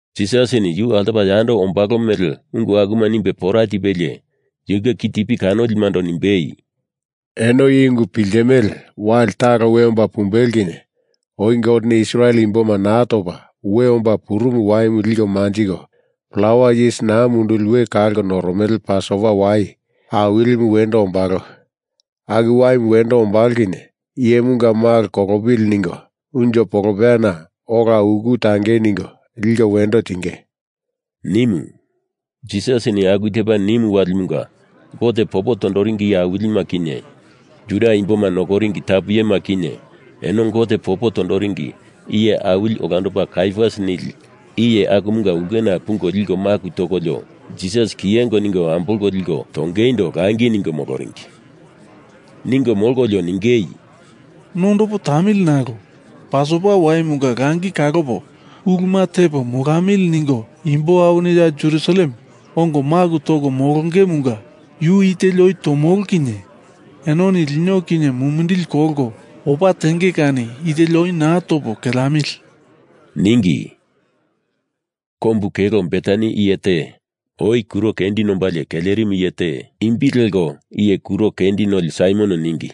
Jisasini yu altopa yando ombalo mele ungu akuma nimbe pora tipelie yunge kitipi kanolimando nimbei, “Eno i ungu piltimele, wali talo we omba pumbelo kinye oi Goteni Israel imboma naa topa we omba purumu waimu liko manjiko plawa yis naa munduli we kalko noromele Pasova wai awilima wendo ombalo. Aku waimu wendo ombalo kinye Iyemunga Malo kolopili ningo unjo polopeyana ola uku tangei ningo liko wendo tinge,” nimu. Jisasini aku tepa nimu walimunga Gote popo tondoringi iye awilima kinye, Juda imboma nokoringi tapu iyema kinye, eno Gote popo tondoringi iye awili olandopa Kaiafas nili iye akumunga ulkena pungo liko maku tokolio, Jisas kiyengo ningo ambolko liko tongeindo langi ningo moloringi. Ningo molkolio ningei, “Nondopo tamili, nalo Pasova waimunga langi kalopo uluma tepo molamili ningo imbo awini ya Jerusalem ongo maku toko molongemunga yu i teli oi tomolo kinye enoni lino kinye mumindili kolko opa tenge kani i teli oi naa topo, keleamili,” ningi. Kombu kelo Betani iye te oi kuro kendi nombalie kelerimu iye te, imbi leko Iye Kuro Kendi Noli Saimon ningi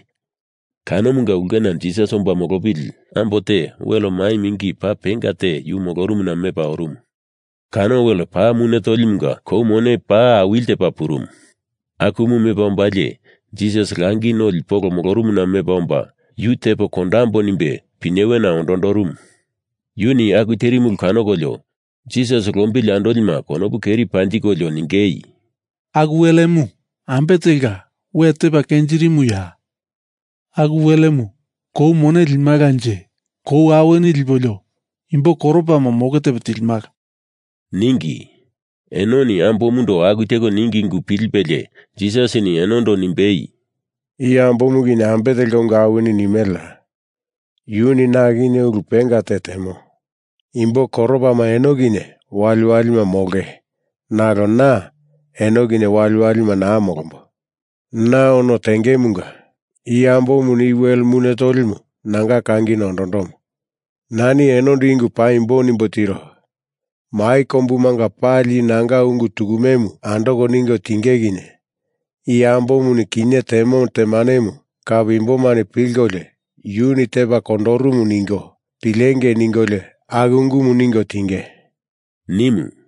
kanomunga ulkena Jisas molopili ambo te wel mai mingi paa penga te yu molorumuna mepa orumu. Kano wel paa mune tolimunga kou mone paa awili tepa purumu. Akumu mepa ombalie Jisas langi noli polo molorumuna mepa omba Yu tepo kondambo nimbe pinyewena ondondorumu. Yuni aku terimu ulu kanokolio Jisas lombili andolima konopu keri panjikolio ningei, “Aku welemu ambe telka we tepa kenjirimuya? Aku welemu kou mone limalanje kou awini lipolio imbo koropama moke tepo tilimala,” ningi. Enoni ambomundo aku teko ningi ungu pilipelie Jisasini enondo nimbei, “I ambomu kinye ambe telka ungu awini nimeleya? Yuni na kinye ulu penga te temo. Imbo koropama eno kinye waliwalima molonge nalo na eno kinye waliwalima naa molombo. Na ono tengemunga i ambomuni i wel mune tolimu nanga kangina ondondomo. Nani enondo i ungu paimbo nimbo tiro, Mai kombumanga pali i nanga ungu tukumemu andoko ningo tinge kinye i ambomuni kinye temo temanemu kape imbomani pilkolio yuni tepa kondorumu ningo pilengei ningolio aku ungumu ningo tinge,” nimu.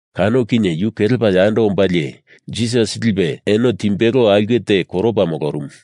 Kano kinye yu kelepa yando ombalie Jisas lipe eno timbelo aulke te koropa molorumu.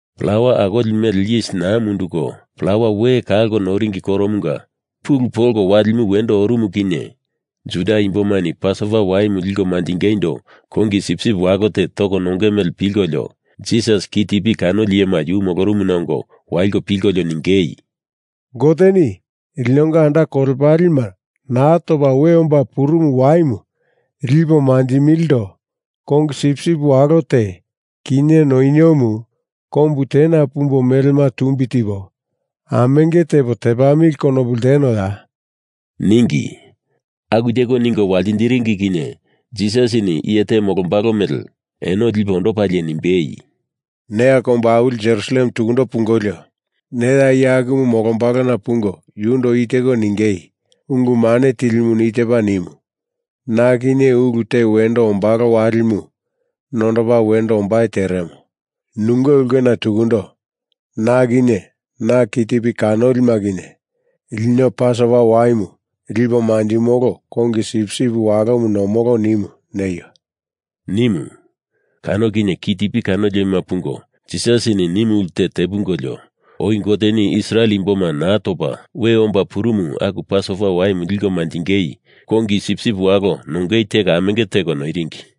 Plawa Akoli Mele Yis Naa Munduko Plawa We Kalko Noringi Koromunga pulu polko walimu wendo orumu kinye Juda imbomani Pasova waimu liko manjingeindo kongi sipsip walo te toko nonge mele pilkolio, Jisas kitipi kanoli iyema yu molorumuna ongo waliko pilkolio ningei, “Goteni linonga anda kolepalema Naa Topa We Omba Purumu waimu lipo manjilimilindo kongi sipsip walo te, kinye noniomu kombu tena pumbo melema tumbi tipo amenge tepo tepamili konopu ltenoya?” ningi. Aku teko ningo waltindiringi kinye Jisasini iye te molombalo mele eno lipe ondopalie nimbei, “Neya kombu awili Jerusalem tuku pungolio, neya iye akumu molombalona pungo yundo i teko ningei, ‘Ungu Mane Tilimuni i tepa nimu, na kinye ulu te wendo ombalo walimu nondopa wendo ombai teremo. Nunge ulkena tukundo na kinye na kitipi kanolima kinye lino Pasova waimu lipo manjimolo kongi sipsip walomu nomolo nimu,’ neio,” nimu. Kano kinye kitipi kanolima pungo Jisasini nimu ulte te pungolio, oi Goteni Israel imboma naa topa we omba purumu aku Pasova waimu liko manjinge kongi sipsip walo nongemu teko amenge teko noiringi.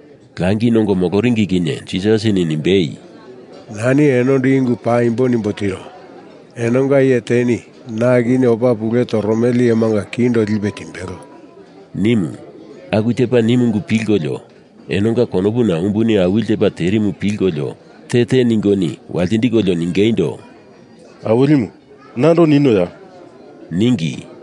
Langi nongo moloringi kinye Jisasini nimbei, “Nani enondo i ungu paimbo nimbo tiro. Enonga iye teni na kinye opa pule toromele iyemanga kindo lipe timbelo,” nimu. Aku tepa nimu ungu pilkolio enonga konopuna umbuni awili tepa terimu pilkolio te te ningoni waltindikolio ningeindo, “Awilimu, nando ninoya?” ningi.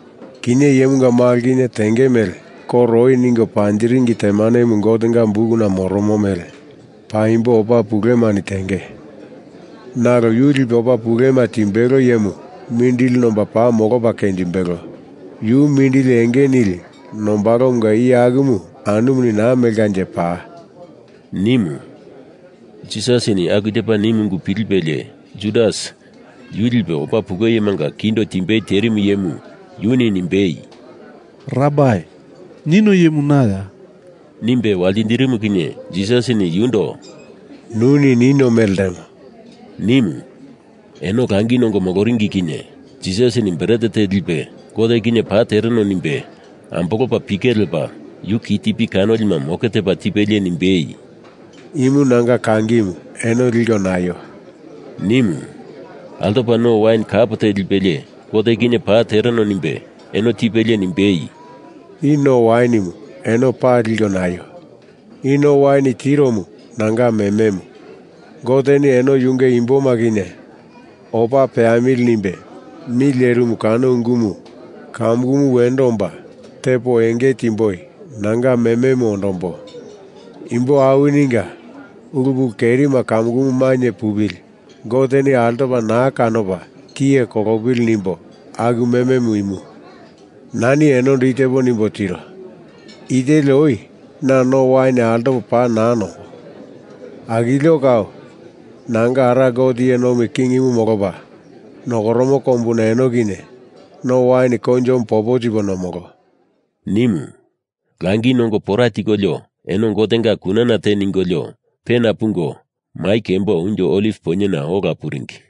Kinye Iyemunga Malo kinye tenge mele koro oi ningo panjiringi temanemu Gotenga bukuna moromo mele paimbo opa pulemani tenge, nalo yu lipe opa pulema timbelo iyemu mindili nomba paa molopa kenjimbelo. Yu mindili enge nili nombalomunga iye akumu anumuni naa melkanje paa,” nimu. Jisasini aku tepa nimu ungu pilipelie Judas, yu lipe opa pulemanga kindo timbei terimu iyemu, yuni nimbei, “Rabai, nino iyemu naya?” nimbe waltindirimu kinye Jisasini yundo “Nuni nino mele ltemo,” nimu. Eno langi nongo moloringi kinye Jisasini bret te lipe Gote kinye paa tereno nimbe ambolopa pike lepa yu kitipi kanolima moke tepa tipelie nimbei, “Imu nanga kangimu eno liko naio,” nimu. Altopa no wain kap te lipelie Gote kinye paa tereno nimbe eno tipelie nimbei, “I no wainimu eno pali liko naio. I no wain tiromu nanga mememu. Goteni eno yunge imboma kinye opa peamili nimbe mi lerimu kano ungumu kamukumu wendo omba tepo enge timboi nanga mememu ondombo. Imbo awininga ulu pulu kerima kamukumu mainye pupili Goteni altopa naa kanopa tiye kolopili nimbo aku mememu imu. Nani enondo i tepo nimbo tiro, i teli oi na no wain altopo paa naa nombo. Akilio kau, Nanga Ara Gote iye nomi kingimu molopa nokoromo kombuna eno kinye no wain koinjomu popo tipo nomolo,” nimu. Langi nongo pora tikolio eno Gotenga kunana te ningolio, pena pungo mai kembo Unjo Oliv Poinyena ola puringi.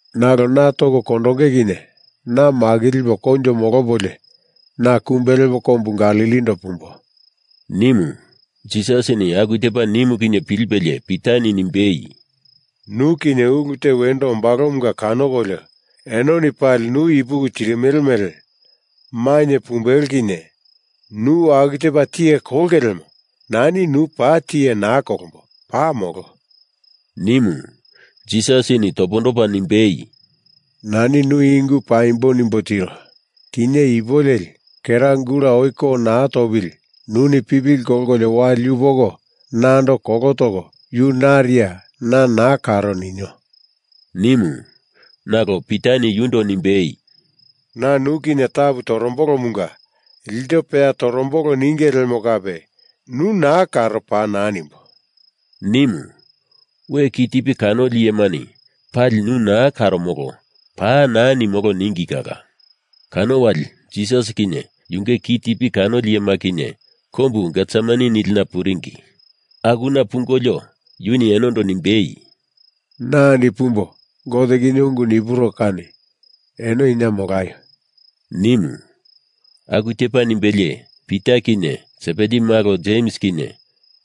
Nalo na toko kondonge kinye na makilipo koinjo molopolio, na kumbe lepo kombu Galilindo pumbo,” nimu. Jisasini aku tepa nimu kinye pilipelie Pitani nimbei, “Nu kinye ulu te wendo ombalomunga kanokolio enoni pali nu ipuki tirimele mele mainye pumbelo kinye nu aku tepa tiye kolonge lemo nani nu paa tiye naa kolombo, paa molo,” nimu. Jisasini topondopa nimbei, “Nani nu i ungu paimbo nimbo tiro, kinye ipu leli, kera gula oi ko naa topili nuni pipili kolkolio wali yupoko nando kolo toko yu nariya na naa karo ninio,” nimu. Nalo Pitani yundo nimbei, “Na nu kinye tapu torombolomunga ilto peya tomolo ninge lemo kape nu naa karo paa naa nimbo,” nimu. We kitipi kanoli iyemani pali nu naa karomolo paa naa nimolo ningi kala. Kano wali Jisas kinye yunge kitipi kanoli iyema kinye kombu Getsemani nilina puringi. Akuna pungolio yuni enondo nimbei, “Na andi pumbo Gote kinye ungu nipuro kani eno ina molaio,” nimu. Aku tepa nimbelie Pita kinye Sebedi malo Jems kinye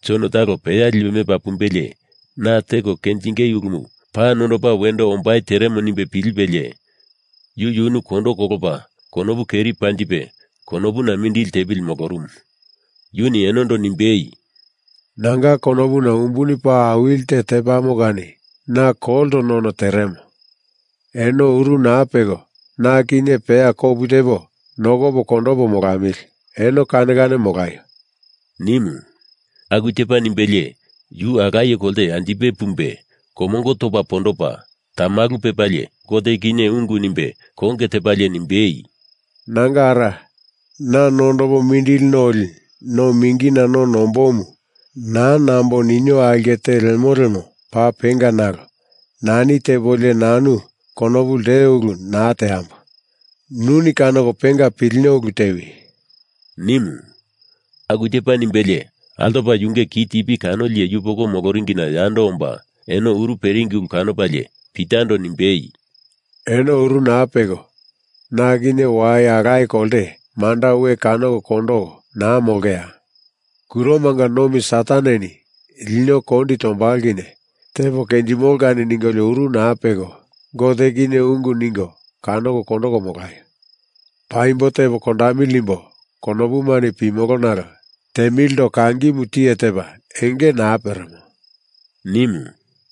Jon talo peya lipe mepa pumbelie na teko kenjinge ulumu paa nondopa wendo ombai teremo nimbe pilipelie yu yunu kondo kolopa konopu keri panjipe konopuna mindili tepili molorumu. Yuni enondo nimbei, “Nanga konopuna umbuni paa awili te tepamo kani na kolto none teremo. Eno uru naa peko na kinye peya kopu tepo nokopo kondopo molamili, eno kane kane molaio,” nimu. Aku tepa nimbelie yu alaye kolte anjipe pumbe komongo topa pondopa tamalu pepalie Gote kinye ungu nimbe konge tepalie nimbei, “Nanga Ara, na nondopo mindili noli no mingina no nombomu naa nambo ninio aulke te lemo lemo paa penga nalo nani tepolio nanu konopu lteo ulu naa teambo. Nuni kanoko penga pilino ulu tewi,” nimu. Aku tepa nimbelie altopa yunge kitipi kanoli iye yupoko moloringina yando omba eno uru peringi ulu kanopalie Pitando nimbei, “Eno uru naa peko na kinye wai alaye kolte manda we kanoko kondoko naa molongeya? Kuromanga nomi Sataneni lino kondi tombalo kinye tepo kenjimolo kani ningolio uru naa peko Gote kinye ungu ningo kanoko kondoko molaio. Paimbo tepo kondamili nimbo konopumani pimolo nalo temilindo kangimu tiye tepa enge naa peremo,” nimu.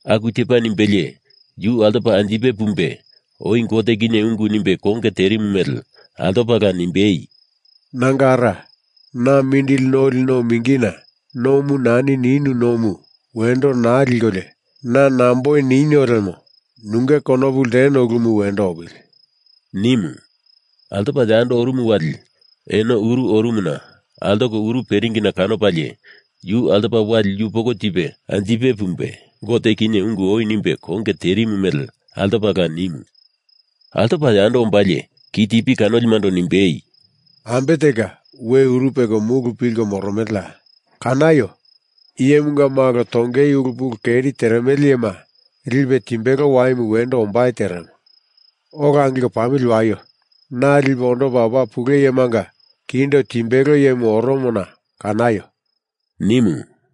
Aku tepa nimbelie yu altopa anjipe pumbe oi Gote kinye ungu nimbe konge terimu mele altopala nimbei, “Nanga Ara, na mindili noli no mingina nomu nani ninu nomu wendo naa likolio na nomboi ninio lemo nunge konopu lteno ulumu wendo opili,” nimu. Altopa yando orumu wali eno uru orumuna altoko uru peringina kanopalie yu altopa wali yupoko tipe anjipe pumbe Gote kinye ungu oi nimbe konge terimu mele altopala nimu. Altopa yando ombalie kitipi kanolimando nimbei, “Ambe telka we uru peko mulu pilko moromeleya? Kanaio! Iyemunga Malo tongei ulu pulu keri teremele iyema lipe timbelo waimu wendo ombai teremo. Ola angilko pamili waio! Na lipe ondopa opa pule iyemanga kindo timbelo iyemu oromona kanaio!” nimu.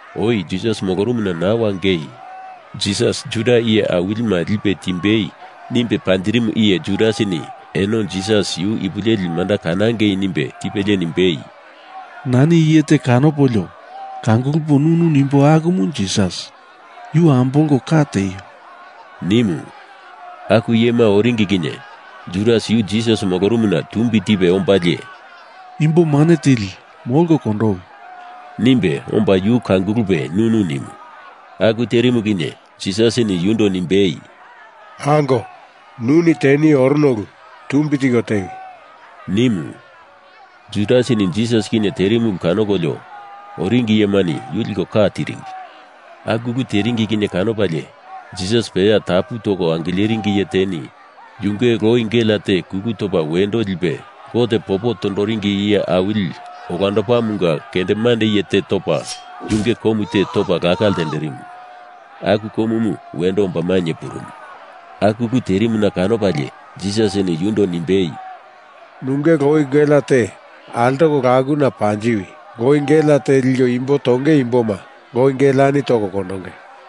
Oi Jisas molorumuna naa wangei Jisas Juda iye awilima lipe timbei nimbe panjirimu iye Judasini eno Jisas yu ipu leli manda kanangei nimbe tipelie nimbei, “Nani iye te kanopolio kangulupo nunu nimbo akumu Jisas. Yu ambolko ka tieio,” nimu. Aku iyema oringi kinye Judas yu Jisas molorumuna tumbi tipe ombalie “Imbo mane tili, molko kondowi,” nimbe omba yu kangulupe nunu nimu. Aku terimu kinye Jisasini yundo nimbei, “Ango, nuni teni orono ulu tumbi tiko tewi,” nimu. Judasini Jisas kinye terimu ulu kanokolio oringi iyemani yu liko ka tiringi. Aku ulu teringi kinye kanopalie Jisas peya tapu toko angileringi iye teni yunge loi gelea te kulu topa wendo lipe Gote popo tondoringi iye awili olandopamunga kendemande iye te topa yunge komu te topa laka ltenderimu, aku komumu wendo omba mainye purumu. Aku ulu terimuna kanopalie Jisasini yundo nimbei, “Nunge loi gelea te altoko lakona panjiwi! Loi gelea te liko imbo tonge imboma loi geleani toko kondonge.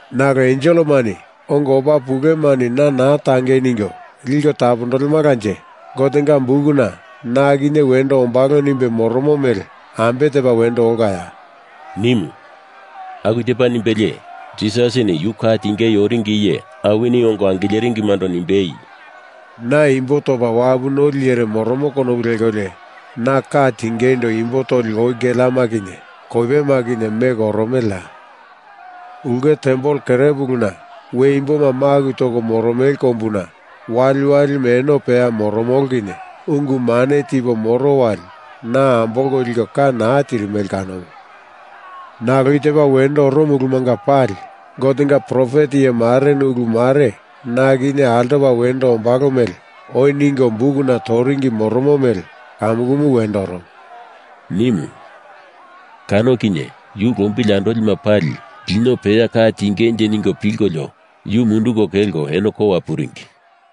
Nalo enselemani ongo opa pulemani na naa tangei ningo liko tapondolemalanje Gotenga bukuna na kinye wendo ombalo nimbe moromo mele ambe tepa wendo olkaya?” nimu. Aku tepa nimbelie Jisasini yu ka tingei oringi iye awini ongo angileringimando nimbei, “Na imbo topa wapu noli iyere moromo konopu lekolio na ka tingeindo imbo toli loi geleama kinye koipema kinye meko oromeleya? Ulke tempel kerepuluna we imboma maku toko moromele kombuna waliwalima eno peya moromolo kinye ungu mane tipo moro wali na ambolko liko ka naa tirimele kanomu. Nalo i tepa wendo oromo ulumanga pali Gotenga profet iye mareni ulu mare na kinye altopa wendo ombalo mele oi ningo bukuna toringi moromo mele kamukumu wendo oromo,” nimu. Kano kinye yu lombili andolima pali lino peya ka tingenje ningo pilkolio yu munduko kolko eno kowa puringi.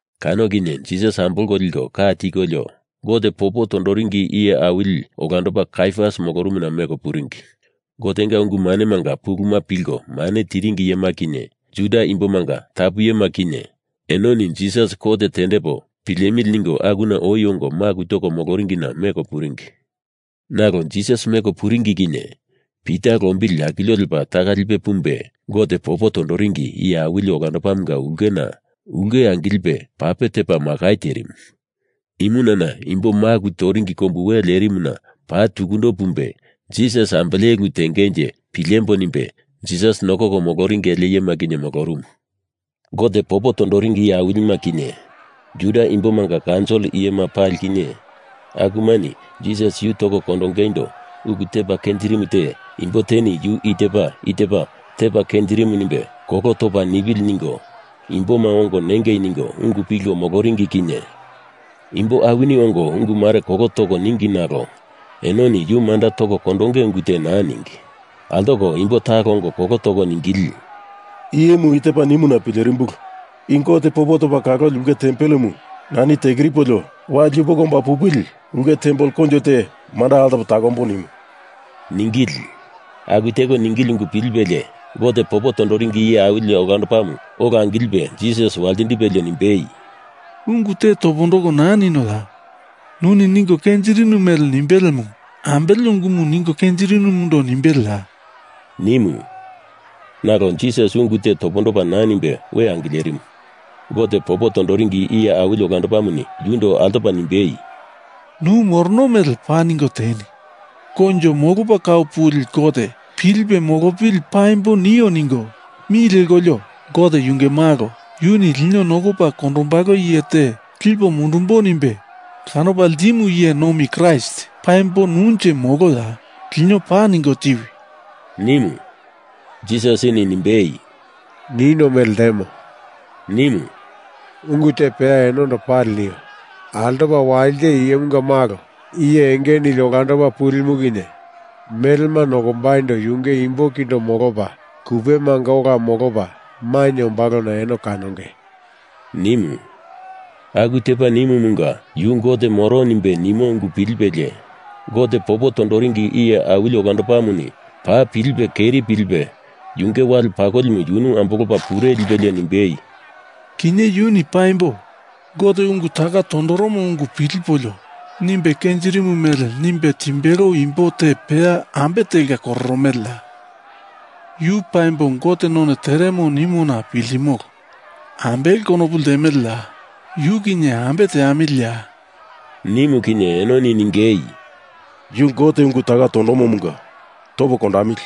Kano kinye Jisas ambolko liko ka tikolio Gote popo tondoringi iye awili olandopa Kaiafas molorumuna meko puringi. Gotenga ungu manemanga puluma pilko mane tiringi iyema kinye, Juda imbomanga tapu iyema kinye, enoni Jisas kot tendepo pilemili ningo akuna oi ongo maku toko moloringina meko puringi. Nalo Jisas meko puringi kinye Pita lombili akilio lepa taka lipe pumbe, Gote popo tondoringi iye awili olandopamunga ulkena, ulke angilipe pape tepa makai terimu, imunana imbo maku toringi kombu we lerimuna paa tukundo pumbe, Jisas ambele ulu tengenje pilemboi nimbe Jisas nokoko moloringi ele iyema kinye molorumu. Gote popo tondoringi iye awilima kinye, Juda imbomanga kaunsil iyema pali kinye, akumani Jisas yu toko kondongeindo ulu tepa kenjirimu te imbo teni yu i tepa i tepa tepa kenjirimu nimbe kolo topa nipili ningo imboma ongo nengei ningo ungu pilko moloringi kinye imbo awini ongo ungu mare kolo toko ningi nalo enoni yu manda toko kondonge ungu te naa ningi. Altoko imbo talo ongo kolo toko ningili, “Iyemu i tepa nimuna pilerimbulu, i Gote popo toko kaloli ulke tempelemu nani tekiripolio, wali yupoko omba pupili ulke tempel koinjo te manda altopo takombo nimu,” ningili. Aku teko ningili ungu pilipelie Gote popo tondoringi iye awili olandopamu ola angilipe Jisas waltindipelie nimbei, “Ungu te topondoko naa ninoya? Nuni ningo kenjirinu mele nimbelemu ambele ungumu ningo kenjirinumundo nimbeleya?” nimu. Nalo Jisas ungu te topondopa naa nimbe we angilerimu. Gote popo tondoringi iye awili olandopamuni yundo altopa nimbei, “Nu morono mele paa ningo tieni. Koinjo Molopa Kau Puli Gote pilipe molopili paimbo nio ningo mi lekolio, Gote yunge Malo, yuni lino nokopa kondombalo iye te lipo mundumbo nimbe kanopa ltimu iye nomi Kraist paimbo nunje moloya? Lino paa ningo tiwi!” nimu. Jisasini nimbei, “Nino mele ltemo,” nimu. “Ungu te peya enondo pali nio. Altopa walite Iyemunga Malo, Iye Enge nili Olandopa Pulimu kinye melema nokombaindo yunge imbo kindo molopa, kupemanga ola molopa mainye ombalona eno kanonge,” nimu. Aku tepa nimumunga, yu Gote moro nimbe nimo ungu pilipelie Gote popo tondoringi iye awili olandopamuni paa pilipe keri pilipe yunge wale pakolimu yunu ambolopa pure lipelie nimbei, “Kinye yuni paimbo Gote ungu taka tondoromo ungu pilipolio nimbe kenjirimu mele nimbe timbelo imbo te peya ambe telka koromoloya? Yu Paimbo Gote none teremo nimona piltimolo. Ambele konopu ltemeleya? Yu kinye ambe teamiliya?” nimu kinye enoni ningei, “Yu Gote ungu taka tondomomunga topo kondamili,”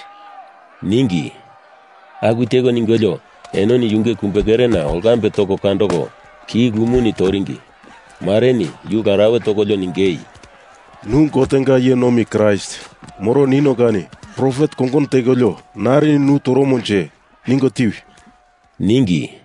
ningi. Aku teko ningolio enoni yunge kumbekerena olkambe toko kandoko, ki lumoni toringi. Mareni yu larauwe tokolio ningei, “Nu Gotenga iye nomi Kraist moro nino kani profet kongono tekolio narini nu toromonje ningo tiwi,” ningi.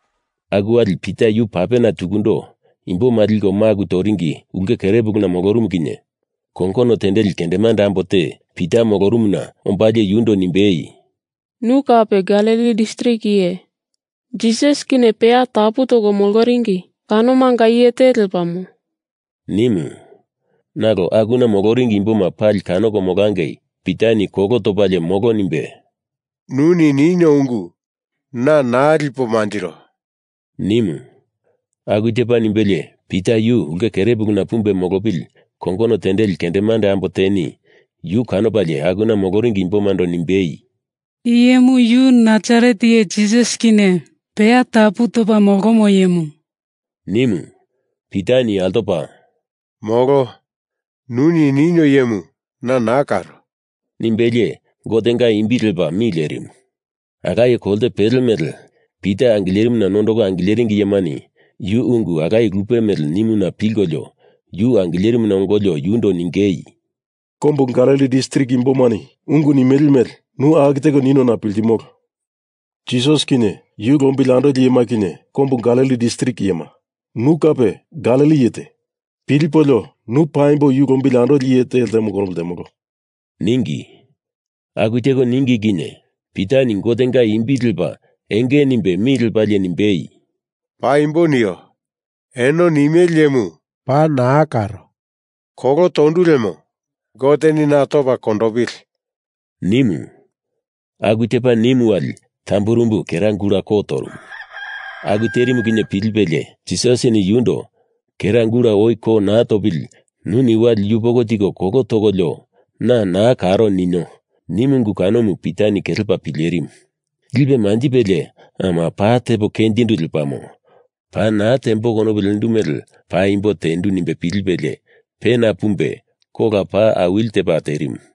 Aku wali Pita yu papena tukundo, imboma liko maku toringi ulke kerepuluna molorumu kinye kongono tendeli kendemande ambo te Pita molorumuna ombalie yundo nimbei, “Nu kape Galili distrik iye. Jisas kinye peya tapu toko moloringi kanomanga iye te lepamo,” nimu. Nalo akuna moloringi imboma pali kanoko molangei Pitani kolo topalie molo nimbe, “Nuni nino ungu na naa lipo manjiro,” nimu. Aku tepa nimbelie Pita yu ulke kerepuluna pumbe molopili kongono tendeli kendemande ambo teni yu kanopalie akuna moloringi imbomando nimbei, “I iyemu Yu Nasaret iye Jisas kinye peya tapu topa molomo iyemu,” nimu. Pitani altopa “Molo. Nuni nino iyemu na naa karo,” nimbelie Gotenga imbi lepa mi lerimu. Alaye kolte pele mele, Pita angilerimuna nondoko angileringi iyemani yu ungu alaye lupe mele nimuna pilkolio yu angilerimuna ongolio yundo ningei, “Kombu Galili distrik imbomani ungu nimele mele nu aku teko ungu nino piltimolo. Jisas kinye yu lombili andoli iyema kinye kombu Galili distrik iyema, nu kape Galili iye te, pilipolio nu paimbo yu lombili andoli iye te ltemo konopu ltemolo,” ningi. Aku teko ningi kinye Pitani Gotenga imbi lepa enge nimbe mi lepalie nimbei, “Paimbo nio. Eno nimele iyemu paa naa karo. Kolo tondu lemo Goteni na topa kondopili,” nimu. Aku tepa nimu wali tamburumbu kera gula ko torumu. Aku terimu kinye pilipelie Jisasini yundo “Kera gula oi ko naa topili nuni wali yupoko tiko kolo tokolio, na naa karo ninio,” nimu ungu kanomu Pita kelepa pilerimu. Lipe manjipelie ama, paa tepo kenjindu lepamo, paa naa tembo konopu lendu mele paimbo tendu nimbe pilipelie pena pumbe kola paa awili tepa terimu.